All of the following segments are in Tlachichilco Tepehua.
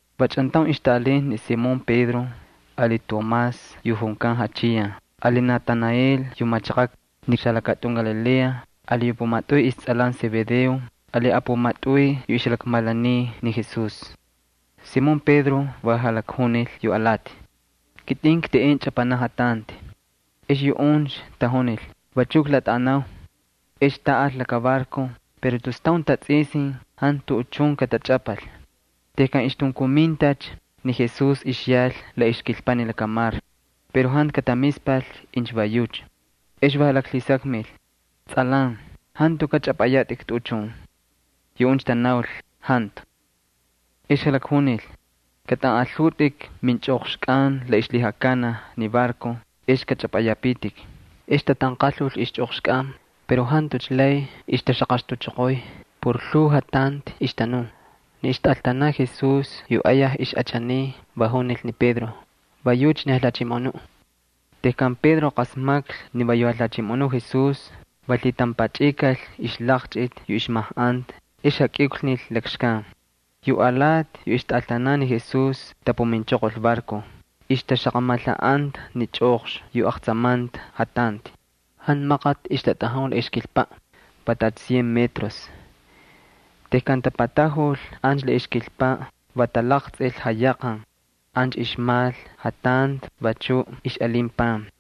Va chꞌantaun ixtaꞌalinta ni Simón Pedro ali Tomás yu junkan Jachiyan ali Natanael yu machaqaꞌ Kaná xalakatꞌun Galilea ali yu pumatꞌuy istsꞌalan Zebedeo ali apumatꞌuy yu ixjalakmalaniy ni Jesús. Ni Simón Pedro va jalakjunil yu alati: —Kitꞌin kteꞌen chꞌapanaꞌ jatanti. Ex yuꞌuncha tajunil: —Vachuꞌ klatꞌaꞌanau. Ex taꞌal laka barco pero tus taun tatsꞌisin jantu tuꞌuchun katachꞌapal. Tejkan ixtunkumintacha ni Jesús ixyal la ixkilpaꞌ ni lakamar pero jantu katamispal incha va yucha. Ex va jalaklhisakmil: —Tsꞌalan, ¿jantukaꞌ chꞌapꞌayatꞌik tuꞌuchun? Yuꞌuncha tanaul: —Jantu. Ex jalakjunil: —Kꞌatꞌanꞌalhutꞌik minchꞌoqxkꞌan la ixlhijakanaj ni barco, ex kꞌachꞌapꞌayapitik. Ex tatanqalhul ixchꞌoqxkꞌan pero jantucha lay ixtaxaqakutuchoqoy por lhuu jatanti ixtanun. Ni ixtꞌaltanaꞌ Jesús yu ayaj ixꞌachaniy va junil ni Pedro: —¡Va yucha ni Jalhachimoꞌonuꞌ! Tejkan Pedro qasmaklhi ni va yu Jalhachimoꞌonu Jesús, va lhitampachꞌikal ixlaqchꞌiti yu ixmajꞌanta ex jakꞌiuklnil lakxkan. Yu alati yu ixtꞌaltanan ni Jesús tapuminchoqol barco, ixtaxaqamalhaꞌanta ni chꞌoqxni yu aqtsamanta jatanti. Jantu maqati ixtatꞌajun la ixkilpaꞌ, va tacha cien metros. Tejkan tapatajul ancha la ixkilpaꞌ va talaqtsꞌil jayaqan. Ancha ixmal jatanti, vachuꞌ ixꞌalin pan.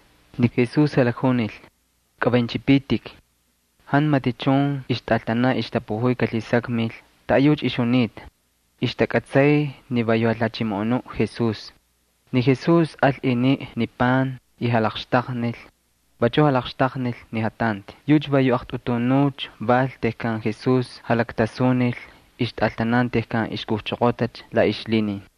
Ni Jesús jalakjunil: —Kꞌavaynchꞌipitik. Jantu matichun ixtꞌaltanan ixtapujuy kalhisakmil taꞌayucha ixjunita. Ixtakꞌatsay ni va yu Jalhachimoꞌonuꞌ Jesús. Ni Jesús al iniꞌ ni pan y jalaqxtaqnil. Vachuꞌ jalaqxtaqnil ni jatanti. Yucha va yu aqtꞌutunucha val tejkan Jesús jalaktasunil ixtꞌaltanan tejkan ixkujchoqotacha la ixlhinin.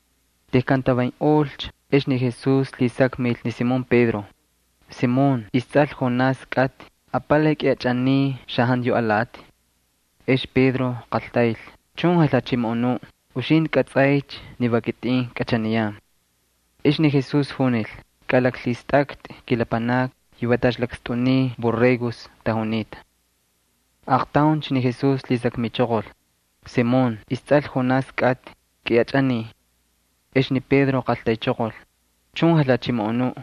Tejkan tavaynꞌolcha ex ni Jesús lhisakmil ni Simón Pedro: —Simón, istsꞌal Jonás kꞌatꞌi, ¿apalay kꞌiꞌachꞌaniy xajantu yu alati? Ex Pedro qaltayl: —Chun, Jalhachimoꞌonuꞌ. Uxintꞌi kꞌatsꞌaycha ni va kitꞌin kꞌachaniyan. Ex ni Jesús junil: —Kꞌalaklhistꞌaktꞌi kilapanakni, yu va tacha lakstꞌuniy borregos tajunita. Aaqtauncha ni Jesús lhisakmichoqol: —Simón, istsꞌal Jonás kꞌatꞌi, ¿kꞌiꞌachꞌaniy? Ex ni Pedro qaltaychoqol: —Chun, Jalhachimoꞌonuꞌ.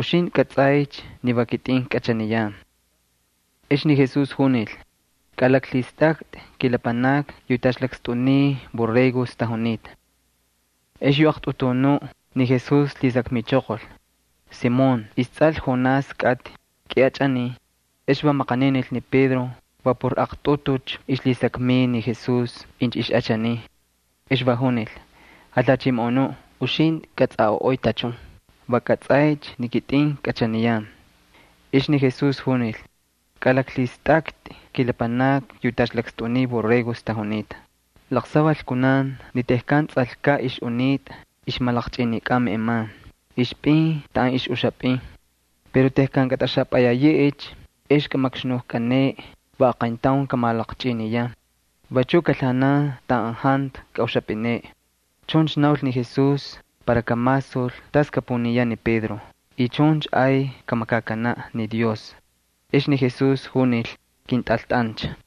Uxintꞌi kꞌatsꞌaycha ni va kitꞌin kꞌachaniyan. Ex ni Jesús junil: —Kꞌalaklhistꞌaktꞌi kilapanakni yu va tacha lakstꞌuniy borregos tajunita. Ex yu aqtꞌutunuꞌ ni Jesús lhisakmichoqol: —Simón, istsꞌal Jonás kꞌatꞌi, ¿kꞌiꞌachꞌaniy? Ex va maqaninil ni Pedro va por aqtꞌutucha ixlhisakmiy ni Jesús incha ixꞌachaniy. Ex va junil: —Jalhachimoꞌonuꞌ, uxintꞌi kꞌatsꞌaꞌoꞌoy tachun. Va kꞌatsꞌaycha ni kitꞌin kꞌachaniyan. Ex ni Jesús junil: —Kꞌalaklhistꞌaktꞌi kilapanakni yu tacha lakstꞌuniy borregos tajunita. Laqsaval kunan ni tejkan tsꞌalkaꞌ ixꞌunitꞌa ixmalaqchꞌinikꞌan meꞌeman, ixpꞌin taꞌan ixꞌuxipꞌin. Pero tejkan kꞌatꞌaxapꞌayayeꞌecha ex kꞌamakxnujkꞌaneꞌe, va aqayntaun kamalaqchꞌiniyan. Vachuꞌ kalhaꞌanan taꞌan jantu kaꞌuxapꞌineꞌe. Chuncha naul ni Jesús para kamasul tas kapuniyaꞌ ni Pedro y chuncha ay kamakakanaꞌ ni Dios. Ex ni Jesús junil: —Kꞌintꞌaltꞌancha.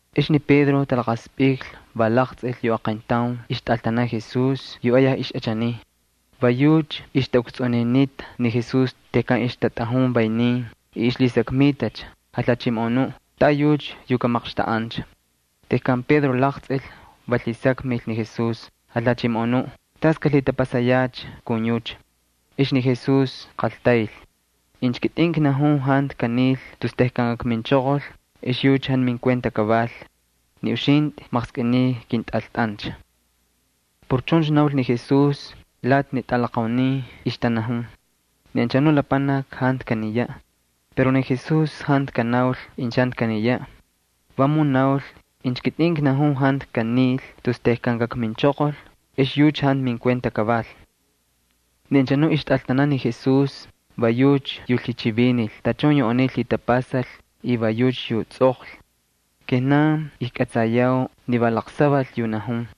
Ex ni Pedro talaqaspꞌiklhi, va laqtsꞌil yu aqayntaun ixtꞌaltanaꞌ Jesús, yu ayaj ixꞌachaniy. Va yucha ixtaꞌukstsꞌuninita ni Jesús tejkan ixtatꞌatꞌajun vaynin y ixlhisakmitacha: “Jalhachimoꞌonuꞌ, ¿taꞌayucha yu kamaqxtaꞌancha?” Tejkan Pedro laqtsꞌil, va lhisakmil ni Jesús: —Jalhachimoꞌonuꞌ, ¿tas kalhitapasayacha kun yucha? Ex ni Jesús qaltayl: —Incha kitꞌin knajun jantu kanil tus tejkan kakminchoqol, ex yucha jantu minkuenta kaval. Ni uxintꞌi maqskꞌiniy kꞌintꞌaltꞌancha. Por chuncha naul ni Jesús, lati ni tꞌalaqaunin ixtanajun ni anchanu lapanaki jantu kaniyaꞌ. Pero ni Jesús jantu kanaul incha jantu kaniyaꞌ, vamun naul: “Incha kitꞌin knajun jantu kanil tus tejkan kakminchoqol, ex yucha jantu minkuenta kaval.” Ni anchanuꞌ ixtꞌaltanaꞌ ni Jesús, va yucha yu lhichivinil tachun yu aniy lhitapasal y va yucha yu tsꞌoqlhi. Kijnan ijkꞌatsayau ni va laqsaval yu najun.